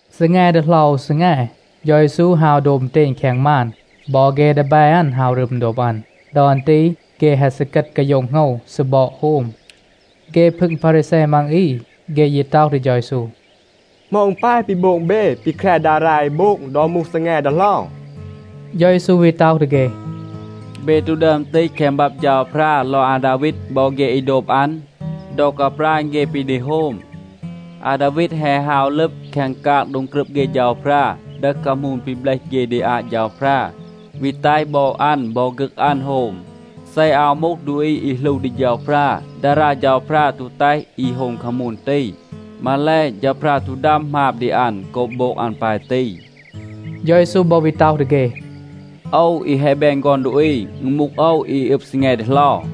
ซีแง ดีเหลา อู ซีแง, เฌา เยซู ฮาว โดบ อึณเตณ แคง มาน. บอ เฆ ดีแบ อัน ฮาว รึม โดบ อัน. ดอ อัน ตี เฆ แฮะ ซีกัด กาโย็ง โหงว, ซีบอด โฮม. เฆ พึง พารีแซ มัง อี, เฆ ยี ต็อห ดี เฌา เยซู, “เหมา อึณ ปาย ปี โบง เบ ปี แคร ดารา เอ โบง ดอ มูห ซีแง ดีเหลา?” เฌา เยซู วี ต็อห ดี เฆ, “เบ ตู ดึอม ตีห แคง บับ เฌาพรา ลอง อาดาวีด บอ เฆ อี โดบ อัน? ดอ กาปราณ เฆ ปี ดี โฮม, อาดาวีด แฮะ ฮาว ลึบ แคง กาง โดง กรึบ เฆ เฌาพรา, ดึห คามูน ปี เบลห เฆ ดี อาต เฌาพรา, วี แตห บอ อัน บอ ฆึก อัน โฮม. เซ อาว มูห ดูอี อี หลู ดี เฌาพรา, ดารา เฌาพรา ตู แตห อี โฮม คามูน ตี. มาแล, เฌาพรา ตู ดัม หมาบ ดี อัน โกบ โบง อัน ปาย ตี.” เฌา เยซู บอ วี ต็อห ดี เฆ, “โอว อี แฮะ แบน ฆอน ดูอี, อึณ มูห โอว อี อึบ ซีแง ดีเหลา.”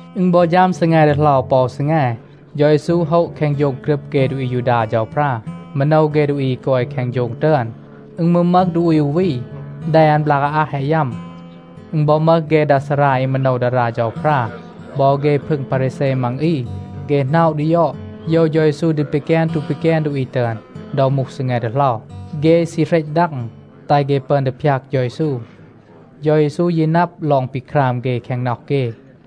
อึณ บอ ฌัม ซีแง ดีเหลา ปอ อู ซีแง, เฌา เยซู โฮะ แคง โฌง กรึบ เฆ ดูอี อายูดา เฌาพรา, มาโนว เฆ ดูอี อี กอย แคง โฌง ตึอน. อึณ มืร มึห ดูอี อู วี, แด อัน บลาก อาอัห แฮะ ยัม. อึณ บอ มึห เฆ ดา ซารา อี มาโนว ดารา เฌาพรา บอ เฆ พึง พารีแซ มัง อี. เฆ หน็อะ ดี ยอด, โยว เฌา เยซู ดี ปีแกน ตู ปีแกน ดูอี ตึอน ดอ มูห ซีแง ดีเหลา. เฆ ซี เหรต ดัง, แตห เฆ ปึอน ดี พยาก เฌา เยซู. เฌา เยซู ยี นับ ลอง ปี คราม เฆ แคง น็อห เฆ.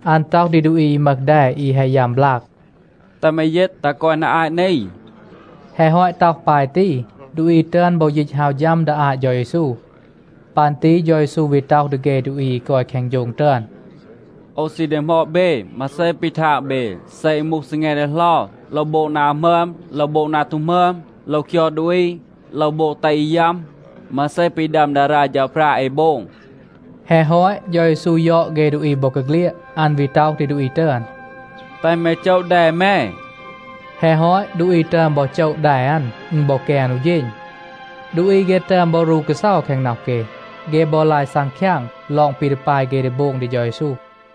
อัน ต็อห ดี ดูอี อี มึห แด อี แฮะ ยัม บลาก, “แตห แม ยีต ตัห กอย นา อาต นี.” แฮะ ฮอต ต็อห ปาย ตี, ดูอี ตึอน บอ ยีต ฮาว ฌัม ดี อาต เฌา เยซู. ปัน ตี เฌา เยซู วี ต็อห ดี เฆ ดูอี อี กอย แคง โฌง ตึอน, “โอว ซี ดีหมอด เบ, มาเซ ปี ทาง เบ. เซ อึณ มูห ซีแง ดีเหลา, โลว โบง นา หมึอม, โลว โบง นา ตู หมึอม? โลว คยอด ดูอี? โลว โบง แตห อี ยัม? มาเซ ปี ดัม ดารา เฌาพรา เอ โบง?” แฮะ ฮอต, เฌา เยซู ยอด เฆ ดูอี บอกาเฆลียด. อัน วี ต็อห ดี ดูอี ตึอน, “แตห แม โจะ แด แม.” แฮะ ฮอต, ดูอี ตึอน บอ โจะ แด อัน. อึณ บอ แกน อู เฌณ. ดูอี เฆ ตึอน บอ รู กาเซา แคง น็อห เฆ. เฆ บอ ลาย ซังคยาง ลอง ปี ดี ปาย เฆ ดี โบง ดี เฌา เยซู.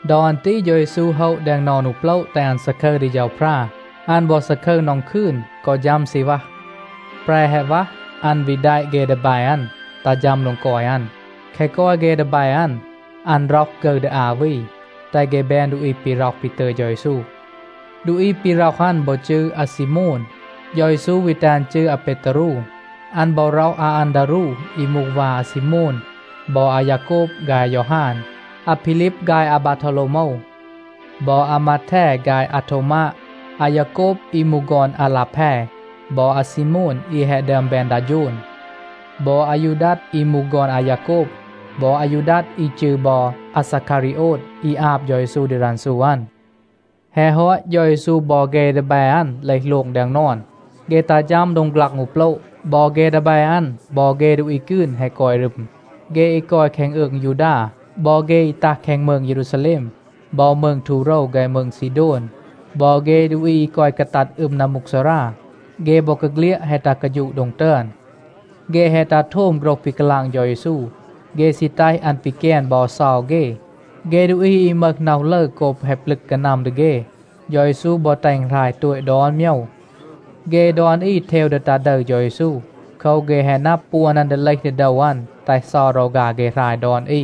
ดอ อัน ตี เฌา เยซู โฮะ แดง นอน อู โปละ แตห อัน ซาคึร ดี เฌาพรา. อัน บอ ซาคึร นอง คืน, กอ ฌัม ซีณวัห. แปร แฮะ วัห, อัน วี แดะ เฆ ดีแบ อัน ตัห ฌัม โดง กอย อัน. แคะ กอย เฆ ดีแบ อัน, อัน ร็อห ฆึร ดี อา วี, แตห เฆ แบน ดูอี ปี ร็อห ปี ตึย เฌา เยซู. ดูอี ปี ร็อห อัน บอ จืร อาซีโมน. เฌา เยซู วี แตห อัน จืร อาเปตารู. อัน บอ ร็อห อาอันดารู อี มูห วา อาซีโมน บอ อายาโกบ ฆาย อายอฮาน, อาพีลีบ ฆาย อาบาโทวโลวโมว บอ อามาแท ฆาย อาโทวมาด, อายาโกบ, อี มูห ฆอน อาลาแพ บอ อาซีโมน, อี แฮะ ดึอม แบน ดา โฌน บอ อายูดัด, อี มูห ฆอน อายาโกบ บอ อายูดัด อี จืร บอ อาซาคารีโอด, อี อาบ เฌา เยซู ดี รันซู อัน. แฮะ ฮอต เฌา เยซู บอ เฆ ดีแบ อัน เลห โลง แดง นอน. เฆ ตัห ฌัม โดง ฆลัง อู โปละ. บอ เฆ ดีแบ อัน, บอ เฆ ดูอี กืน แฮะ กอย รึม. เฆ อี กอย แคง อืง ยูดา, บอ เฆ อี ตัห แคง มืง เยรูซาแลม บอ มืง ทูโรว ฆาย มืง ซีโดน, บอ เฆ ดูอี อี กอย กาตัด อึม นัมมูกซารา, เฆ บอกาเฆลียด แฮะ ตัห กาฌูะ โดง ตึอน. เฆ แฮะ ตัห โทม โฆรห ปี กาลาง เฌา เยซู. เฆ ซี แตห อัน ปีแกน บอ เซา เฆ. เฆ ดูอี อี มึห น็อห ลึร โกบ แฮะ ปลึก กานัม ดี เฆ, เฌา เยซู บอ แตห อึณ หราย โตต ดอน โมยว. เฆ ดอน อี เทว ดี ตา ดึร เฌา เยซู. โคว, เฆ แฮะ นับ, ปวน อัน ดี เลห ดี โดว อัน, แตห เซา รอฆา เฆ หราย ดอน อี.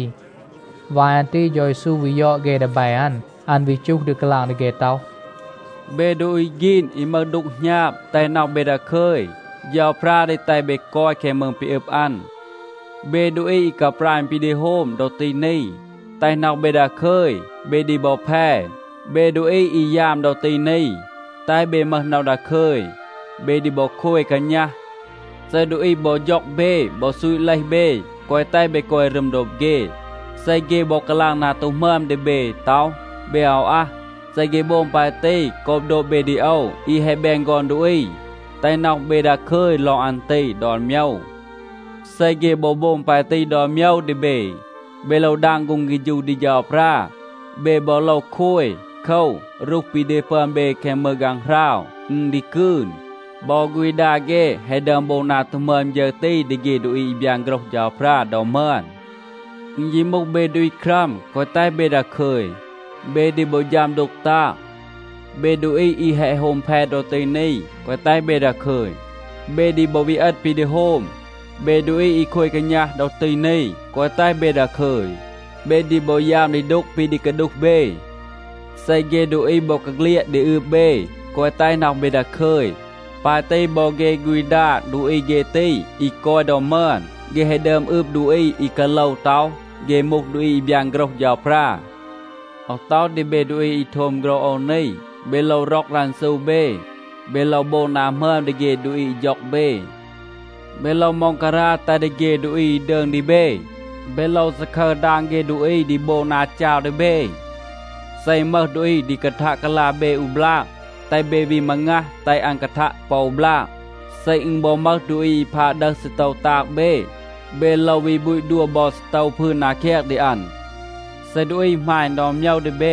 วาย อัน ตี เฌา เยซู วี ยอด เฆ ดีแบ อัน. อัน วี จูห ดี กาลาง ดี เฆ ต็อห, “เบ ดูอี ฆีน, อี มึห ดูก หณาบ, แตห น็อห เบ ดาคึย. เฌาพรา ดี แตห เบ กอย แคง มืง ปี อึบ อัน. เบ ดูอี อี กาปราณ ปี ดี โฮม ดอ ตี นี, แตห น็อห เบ ดาคึย. เบ ดี บอ แพ. เบ ดูอี อี ยาม ดอ ตี นี, แตห เบ มึห น็อห ดาคึย. เบ ดี บอ โคย กาณัห. เซ ดูอี บอ ฌ็อง เบ บอ ซูต เลห เบ, แกวะ แตห เบ กอย รึม โดบ เฆ, เซ เฆ บอ กาลาง นา ตู หมึอม ดี เบ ต็อห, เบ อาว อัห, เซ เฆ โบง ปาย ตี โกบ โดบ เบ ดี โอว อี แฮะ แบน ฆอน ดูอี, แตห น็อห เบ ดาคึย ลอง อัน ตี ดอน โมยว. เซ เฆ บอ โบง ปาย ตี ดอน โมยว ดี เบ, เบ โลว ดาง ฆูง เฆฌู ดี เฌาพรา. เบ บอ โลว โคย. โคว, รูห ปี ดี ปึอน เบ แคง มืง ฆางหราว, อึณ ดี กืน. บอ ฆูณ ดา เฆ แฮะ ดึอม โบง นา ตู หมึอม ฌึร ตี ดี เฆ ดูอี อี บยาน โฆรห เฌาพรา ดอ มึอน. อึณ ยี มูห เบ ดูอี ครัม, แกวะ แตห เบ ดาคึย. เบ ดี บอ ฌัม ดูก ตาง. เบ ดูอี อี แฮะ โฮม แพ ดอ ตี นี, แกวะ แตห เบ ดาคึย. เบ ดี บอ วี เอต ปี ดี โฮม. เบ ดูอี อี โคย กาณัห ดอ ตี นี, แกวะ แตห เบ ดาคึย. เบ ดี บอ ยาม ดี ดูก ปี ดี กาดูห เบ. เซ เฆ ดูอี บอกาเฆลียด ดี อืบ เบ, แกวะ แตห น็อห เบ ดาคึย. ปาย ตี บอ เฆ ฆูณ ดา ดูอี เฆ ตี อี กอย ดอ มึอน, เฆ แฮะ ดึอม อืบ ดูอี อี กาโลว ต็อห เฆ มูห ดูอี อี บยาน โฆรห เฌาพรา. โอว ต็อห ดี เบ ดูอี อี โทม โฆรห โอว นี, เบ โลว ร็อก รันซู เบ. เบ โลว โบง นา หมึอม ดี เฆ ดูอี อี ฌ็อง เบ. เบ โลว ม็องการา แตห ดี เฆ ดูอี อี ดืง ดี เบ. เบ โลว ซาคึร ดาง เฆ ดูอี ดี โบง นา จาว ดี เบ. เซ อึณ มึห ดูอี ดี กาทัะ กาลา เบ อู บลาก, แตห เบ วี มางัห, แตห อัน กาทัะ ปอ บลาก. เซ อึณ บอ มึห ดูอี อี พาด ดึห ซีโตว ตาง เบ, เบ โลว วี บูต ดัว บอ ซีโตว พืน นา แคง ดี อัน. เซ ดูอี หมาณ ดอน โมยว ดี เบ,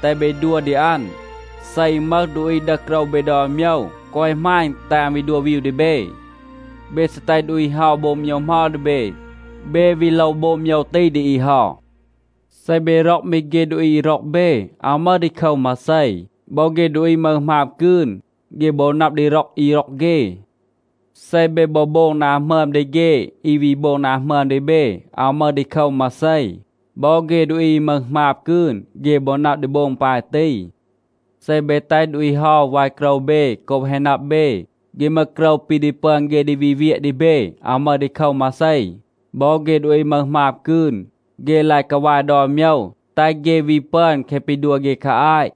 แตห เบ ดัว ดี อัน. เซ อึณ มึห ดูอี ดึห โกรว เบ ดอน โมยว, แกวะ หมาณ แตห อัน วี ดัว วีว ดี เบ. เบ ซี แตห ดูอี เฮา โบง โมยว เหมา ดี เบ, เบ วี โลว โบง โมยว ตี ดี อี เฮา. เซ เบ ร็อก มี เฆ ดูอี อี ร็อก เบ, อาว มึห ดีโคว มาเซ. บอ เฆ ดูอี มึห หมาบ กืน, เฆ บอ นับ ดี ร็อก อี ร็อก เฆ. เซ เบ บอ โบง นา หมึอม ดี เฆ อี วี โบง นา หมึอม ดี เบ, อาว มึห ดีโคว มาเซ. บอ เฆ ดูอี อี มึห หมาบ กืน, เฆ บอ นับ ดี โบง ปาย ตี. เซ เบ แตห ดูอี เฮา วาย โกรว เบ โกบ แฮะ นับ เบ, เฆ มึห โกรว ปี ดี ปึอน เฆ ดี วี เวียะ ดี เบ, อาว มึห ดีโคว มาเซ. บอ เฆ ดูอี มึห หมาบ กืน, เฆ ลาย กาวาย ดอน โมยว, แตห เฆ วี ปึอน แคะ ปี ดัว เฆ คา อาต.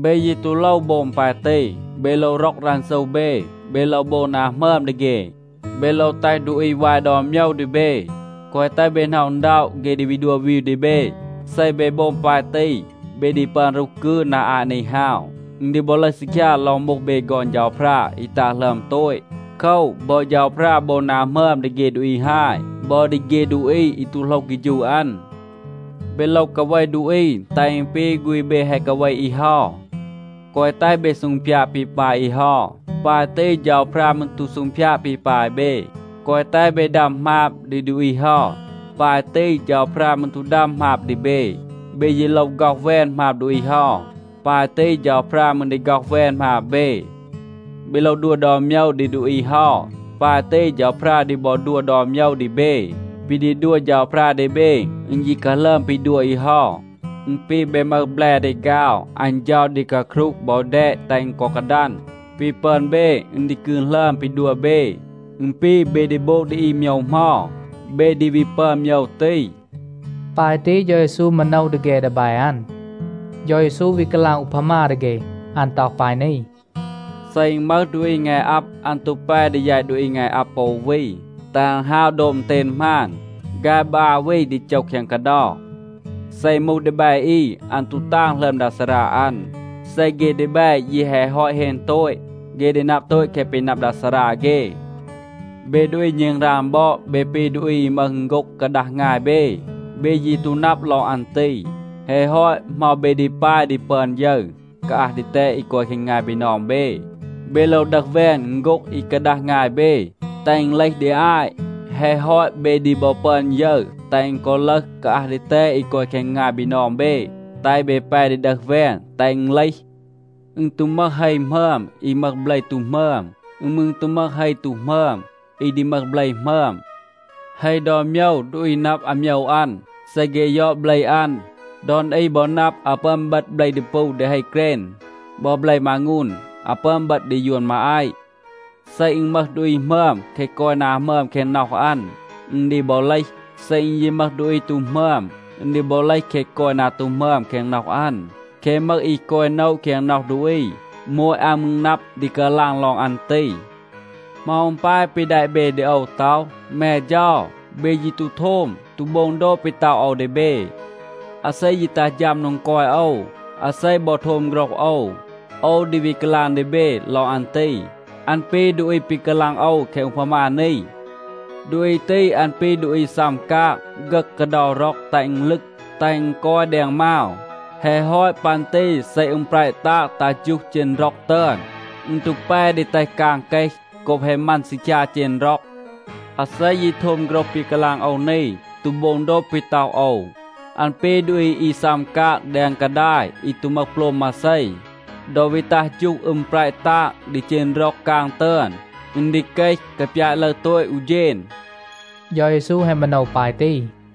เบ ยี ตู โลว โบง ปาย ตี. เบ โลว ร็อก รันซู เบ. เบ โลว โบง นา หมึอม ดี เฆ. เบ โลว แตห ดูอี วาย ดอน โมยว ดี เบ, แกวะ แตห เบ หน็อะ อึณด็อะ เฆ ดี วี ดัว วีว ดี เบ. เซ เบ โบง ปาย ตี, เบ ดี ปึอน รูห กืน นา อาต นี ฮาว. อึณ ดี บอ ลึห ซีคยา ลอง มูห เบ ฆอน เฌาพรา อี ตาง หลึอม โตต. โคว, บอ เฌาพรา โบง นา หมึอม ดี เฆ ดูอี ฮาย บอ ดี เฆ ดูอี อี ตู โหลห เฆฌู อัน. เบ โลว กาเว ดูอี, แตห อึณ ปี ฆูณ เบ แฮะ กาเว อี เฮา. แกวะ แตห เบ ซูงพยาด ปี ปาย อี เฮา. ปาย ตี เฌาพรา มืร ตู ซูงพยาด ปี ปาย เบ. แกวะ แตห เบ ดัม หมาบ ดี ดูอี เฮา. ปาย ตี เฌาพรา มืร ตู ดัม หมาบ ดี เบ. เบ ยี โลว ฆ็อห แวน หมาบ ดูอี เฮา. ปาย ตี เฌาพรา มืร ดี ฆ็อห แวน หมาบ เบ. เบ โลว ดัว ดอน โมยว ดี ดูอี เฮา. ปาย ตี เฌาพรา ดี บอ ดัว ดอน โมยว ดี เบ. ปี ดี ดัว เฌาพรา ดี เบ, อึณ ยี กาหลึอม ปี ดัว อี เฮา. อึณ ปี เบ มึห แบล ดีฆาว. อัน เฌา ดี กาครูห บอ แดต, แตห อึณ กอ กาดัน. ปี ปึอน เบ อึณ ดี กืน หลึอม ปี ดัว เบ. อึณ ปี, เบ ดี โบง ดี อี โมยว เหมา, เบ ดี วี ปึอน โมยว ตี.” ปาย ตี เฌา เยซู มาโนว ดี เฆ ดีแบ อัน. เฌา เยซู วี กาลาง อูพามา ดี เฆ. อัน ต็อห ปาย นี. “เซ อึณ มึห ดูอี งาย อับ, อัน ตู แป ดี แยต ดูอี งาย อับ ปอ อู วี, แตห อัน ฮาว โดบ อึณเตณ หมาน. ฆาย บอ อา วี ดี โจห แคง กาเดา. เซ อึณ มูห ดีแบ อี, อัน ตู ตาง หลึอม ดา ซารา อัน. เซ เฆ ดีแบ ยี แฮะ ฮอต เฮน โตต, เฆ ดี นับ โตต แคะ ปี นับ ดา ซารา เฆ. เบ ดูอี ณึงราง บอด, เบ ปี ดูอี อี มึห อึณโฆ็ง กาดัห งาย เบ. เบ ยี ตู นับ ลอง อัน ตี. แฮะ ฮอต, เหมา เบ ดี ปาย ดี ปึอน ยึร กาอัห ดีแตด อี กอย แคง งาย บีนอง เบ. เบ โลว ดึห แวน อึณโฆ็ง อี กาดัห งาย เบ, แตห อึณ เลห ดี อาต. แฮะ ฮอต, เบ ดี บอ ปึอน ยึร แตห อึณ กอ ลึห กาอัห ดีแตด อี กอย แคง งาย บีนอง เบ, แตห เบ แป ดี ดึห แวน, แตห อึณ เลห. อึณ ตู มึห เฮ หมึอม, อี มึห เบล ตู หมึอม. อึณ มืร ตู มึห เฮ ตู หมึอม, อี ดี มึห เบล หมึอม. เฮ ดอน โมยว, ดูอี นับ อาโมยว อัน, เซ เฆ ยอด เบล อัน. ดอน อี บอ นับ, อาว ปึอน เบต เบล ดีปู ดี เฮ เกรณ. บอ, เบล มางูน อาว ปึอน เบต ดี ยวน มาอาต. เซ อึณ มึห ดูอี หมึอม, แคะ กอย นา หมึอม แคง น็อห อัน, อึณ ดี บอ เลห. เซ อึณ ยี มึห ดูอี ตู หมึอม, อึณ ดี บอ เลห แคะ กอย นา ตู หมึอม แคง น็อห อัน. แคะ มึห อี กอย โนะ แคง น็อห ดูอี, โมต อัน มืร นับ ดี กาลาง ลอง อัน ตี. เหมา อึณ ปาย ปี แดะ เบ ดี โอว ต็อห, ‘แม เฌา’? เบ ยี ตู โทม, ตู โบง โดบ ปี ต็อห โอว ดี เบ. อาเซ ยี ตัห ฌัม โดง กอย โอว, อาเซ บอ โทม โฆรห โอว, โอว ดี วี กาลาง ดี เบ ลอง อัน ตี. อัน ปี ดูอี ปี กาลาง โอว แคง อูพามา นี. ดูอี ตี, อัน ปี ดูอี ซัม กาง, ฆึห กาเดา ร็อง แตห อึณ ลึก, แตห อึณ กอย แดง มาว. แฮะ ฮอต ปัน ตี เซ อึม แประ ตาง ตัห ฌูห เจณ ร็อง ตึอน, อึณ ตู แป ดี แตห กาง เกห โกบ แฮะ มัน ซีคยา เจณ ร็อง. อาเซ ยี โทม โฆรห ปี กาลาง โอว นี, ตู โบง โดบ ปี ต็อห โอว, อัน ปี ดูอี อี ซัม กาง แดง กาดาย อี ตู มึห โปลม มาเซ. ดอ วี ตัห ฌูห อึม แประ ตาง ดี เจณ ร็อง กาง ตึอน, อึณ ดี เกห กาปยาต ลึร โตต อู เฌณ.” เฌา เยซู แฮะ มาโนว ปาย ตี.